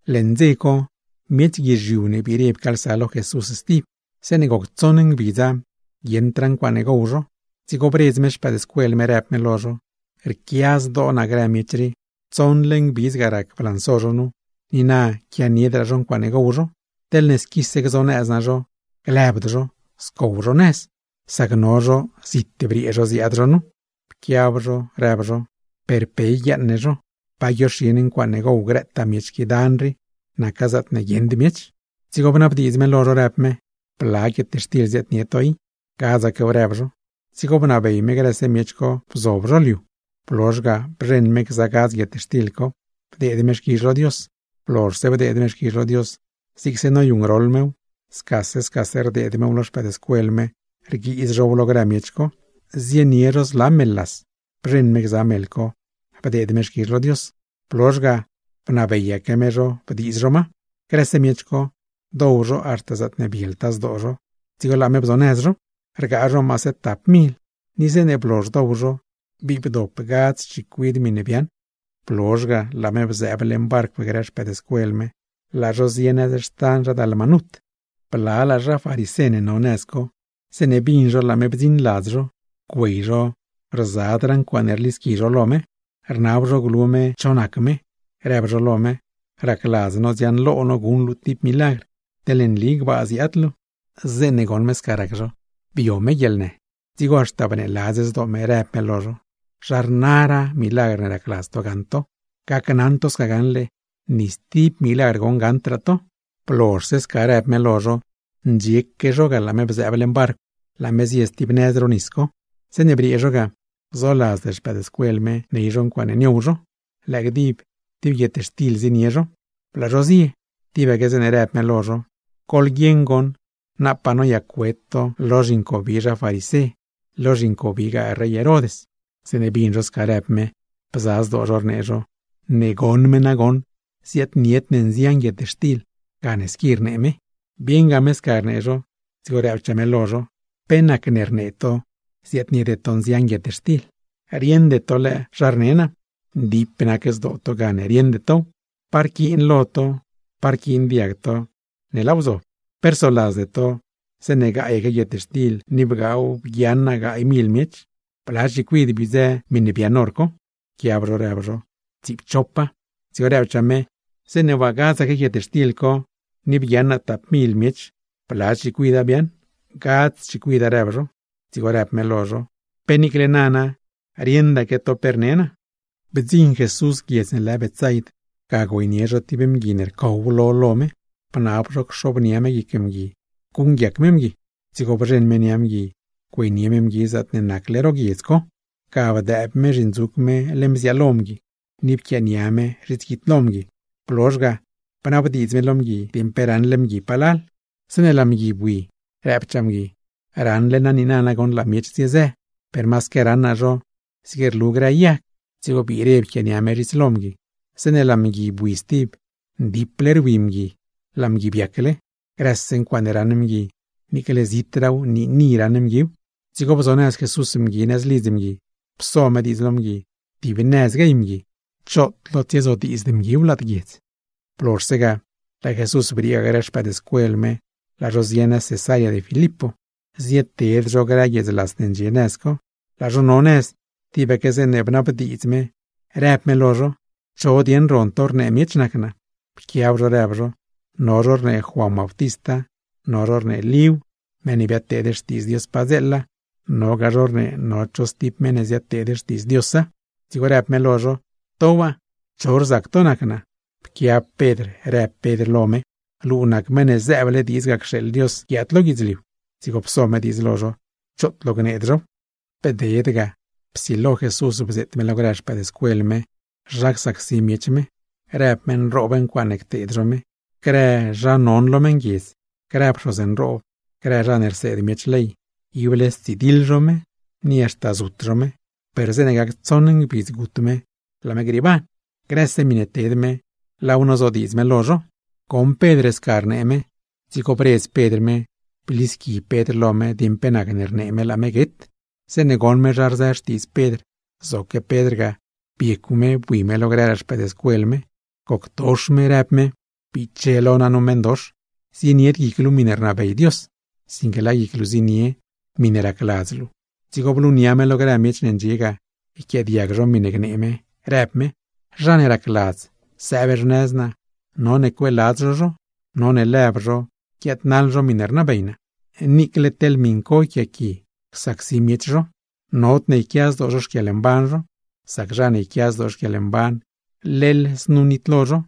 Leṉ dze co, miech guizhiu ne biire pcaalsa lo Jesús stib. Zeeṉe goc tsoṉ ngbidza, guieṉdraa ncuaaṉe gow zho. Dzigo bredz me xpëëdscuel me, rëb me lo zho: ―Rquia zdoo naa grë miech rii, tsoṉle ngbidz ga rac blanso zho nu, ni na quianiedraa zho ncuaaṉe gow zho. Teḻne squise zho gzonëz naa zho, glëbd zho, scow zho nëz, sac no zho zit briee zho ziaad zho nu. Pquiab zho rëb zho: ―¿Per pe yguiaaṉ ne zho? ¿Pa guioxi ne guietxtil ne gow grëtaa miech qui dan rii, naca zaatne guieṉd miech? Dzigo bnabdiidz me lo zho, rëb me: ―¿Bla guietxtil ziaadnie to i? ―Gadzaquew ―rëb zho. Dzigo bnabey me grëse miech co bzob zho liu. Blozh ga bzheṉ me gza guietxtil co, bdeed me xquizh lo Dios; blozhse bdeed me xquizh lo Dios, zigse noyuṉgroḻ mew, scase scase rdeed mew lo xpëëdscuel me rguiiz zhow lo grë miech co. Zienie zho zla meḻ las; bzheṉ me gza meḻ co bdeed me xquizh lo Dios, blozh ga bnabeyaque me zho bdiiz zho ma. Grëse miech co, dow zho haxta zaatne bieltaa zho dzigo laa me bzonëz zho. Rgaa zho maase tap mil, ni zeeṉe blozh dow zho bii bdop gadz chicuid miṉe biaaṉ. Blozh ga, laa me bzëëb leṉ barcw grë xpëëdscuel me, laa zho zie nëz xtan zha Dalmanut. Blalaa zha farisé ne no nëz co, zeeṉe bin zho laa me bdziṉ ladz zho, güey zho rzadraa ncuaaṉe rlisqui zho lo me. Rnab zho glu me cho nac me, rëb zho lo me: ―Racladz no dziaṉlo no guṉ luu tib milagr, teḻne nli gbaa ziaad luu. Zeeṉe goṉ me sca rac zho, bio me guieḻnë; dzigo haxta bneeladz zdoo me, rëb me lo zho: ―¿Zha rnaraa milagr ne racladz to gaṉ to? Gneli naa lo to gaṉle, ni stib milagr goṉ gaṉdraa to. Blozhse sca rëb me lo zho, ndxieque zho ga laa me bzëëb leṉ barcw laa me zie stib nëz ro nis co. Zeeṉe briee zho ga, zoladzd xpëëdscuel me ney zho ncuaaṉe niow zho, lëë gdib tib guietxtil zienie zho leṉ barcw. Laa zho zie, tibaque zeeṉe rëb me lo zho: ―Goḻguieṉ goṉ, napaa noyac-wet to lo zhincobi zha farisé, lo zhincobigaa rey Herod. Zeeṉe bin zho sca rëb me, bza zdoo zho rnee zho: ―Ne goṉ me nagoṉ ziaadnied ne guietxtil gane squi rnee me. Bieṉ me sca rnee zho, dzigo rëbchaa me lo zho: ―¿Pe nacne rnee to ziaadniede to guietxtil? ¿Rieṉde to lëë zha rne naa? Ndip nac zdoo to gane rieṉde tow. ¿Pa rquiin lo to, pa rquiin diag to ne laaw zob? ¿Pe rsoladzde to zeeṉe gaayaque guietxtil ni bgaaw bguiaṉ naa gaay mil miech? ¿Bla chicuid biodzë miṉe biaaṉ hor co? Pquiab zho rëb zho: ―Tsiipchopa. Dzigo rëbchaa me: ―Zeeṉe waa gadzaque guietxtil co, ni bguiaṉ naa tap mil miech, ¿bla chicuida biaaṉ? ―Gadz chicuida ―rëb zho. Dzigo rëb me lo zho: ―¿Pe niicle nana rieṉdaque to pe rne naa? Bdziṉ Jesús guiedz ne lë Betsaid, ga güeynie zho tib mgui ne rcow lo lo me, bnab zho cxobnia me guic mgui guṉguiac me mgui. Dzigo bzheṉ me nia mgui güeynie me mgui zaatne nacle ro guiedz co. Ga bdëëb me zhindzuc me leṉ bziaalo mgui, ni pquiaania me zhits guidlo mgui; blozh ga bnabdiidz me lo mgui dieṉ pe raṉle mgui palal. Zeeṉe laa mgui bui, rëbchaa mgui: ―Raṉle naa niina nagoṉ laa miech ziezë; per masaque raṉ naa zho zig rlu grë yag. Dzigo biire pquiaania me zhits lo mgui. Zeeṉe laa mgui bui stib, ndiple rwi mgui laa lo mgui biacle. Grëse ncuaaṉe raṉ mgui, niicle zitraaw niini raṉ mguiw. Dzigo bzonëz Jesús mgui nëz lidz mgui, pso me diidz lo mgui tib nëz guey mgui, choot lo tsiezodiidzd mguiw lad guiedz. Blozhse ga, laa Jesús briee ga grë xpëëdscuel me laa zho zie nëz Cesarea de Filipo, zieted zho grë guiedz las ne ndxie nëz co. Laa zho no nëz, tibaque zeeṉe bnabdiidz me rëb me lo zho: ―¿Cho dieṉ ron to rnee miech nac naa? Pquiab zho, rëb zho: ―No zho rnee Juan Bautista, no zho rnee Líw, meṉ ne biadteed xtiidz Dios padzeela; nogaa zho rnee no cho stib meṉ ne ziadteed xtiidz Diosa. Dzigo rëb me lo zho: ―¿To waa, cho rzac to nac naa? Pquiab Pedr, rëb Pedr lo me: ―¡Luu nac Meṉ ne zëëble diidz ga cxeeḻ Dios guiaad lo guidzliu! Dzigo pso me diidz lo zho choot lo gneed zhow. Bded ga, psilo Jesús bzeet me lo grë xpëëdscuel me zha csacsi miech me. Rëb me nroob grë ncuaaṉe cteed zho me; grë zha non lo meṉguiedz, grë pxoz nroob, grë zha ne rseed miech ley, ible stsidiḻ zho me, ni haxta zut zho me; per zeeṉe gac tsoṉ ngbidz gut me laa me grieeban. Grëse miṉe ted me, laaw nozodiidz me lo zho. Goṉ Pedr sca rnee me, dzigo bredz Pedr me, blisqui Pedr lo me dieṉ pe nacne rnee me laa me guet. Zeeṉe goṉ me zha rzë xtiidz Pedr, zoque Pedr ga biecw me bui me lo grëraa xpëëdscuel me, goctox me rëb me: ―¡Biche lo naa nu meṉdox! Zienied guic luu miṉe rnabey Dios, sinque laa guic luu zienie miṉe racladz luu. Dzigo blunia me lo grë miech ne ndxie ga, yquiaadiag zho miṉe gnee me; rëb me: ―Zha ne racladz sëëb xnëz naa, none cueeladz zho zho, none lëb zho guiaadnaḻ zho miṉe rnabey naa, niicle teḻ miṉ co yquiaaqui csacsi miech zho. Nodne yquia zdoo zho xquieḻmban zho. Sac zha ne yquia zdoo xquieḻmban, leḻ znu nitlo zho;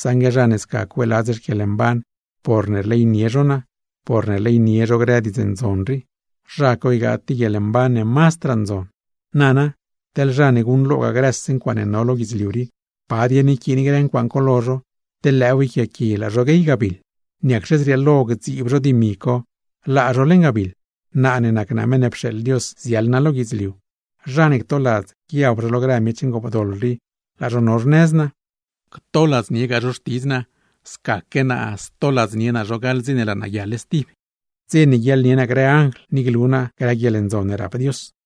saṉgue zha ne sca cueeladz xquieḻmban porne rleynie zho naa, porne rleynie zho grë Diidz Ndzon rii, zha co ygaa tib guieḻmban ne mazdraa ndzon. Nana, teḻ zha ne guṉlo grëse ncuaaṉe no lo guidzliu rii. ¿Pa yquiin grë ncuaaṉ co lo zho, teḻ lëëw yquiaaqui laa zho guey gabiḻ? ¿Niacxe zrieelo gdziib zho dimi co laa zho leṉ gabiḻ? Naa ne nac naa Meṉ ne pxeeḻ Dios ziaḻ naa lo guidzliu, zha ne ctoladz guiab zho lo grë miech ngoopdoḻ rii laa zho no xnëz naa, o ctoladzniegaa zho xtidz naa, scaque naa stoladznie naa zho gaḻ dze ne laa naa guiaḻ stib. Dze ne guiaḻnie naa grë anjl, ni glu naa grë guieḻndzon ne rap Dios.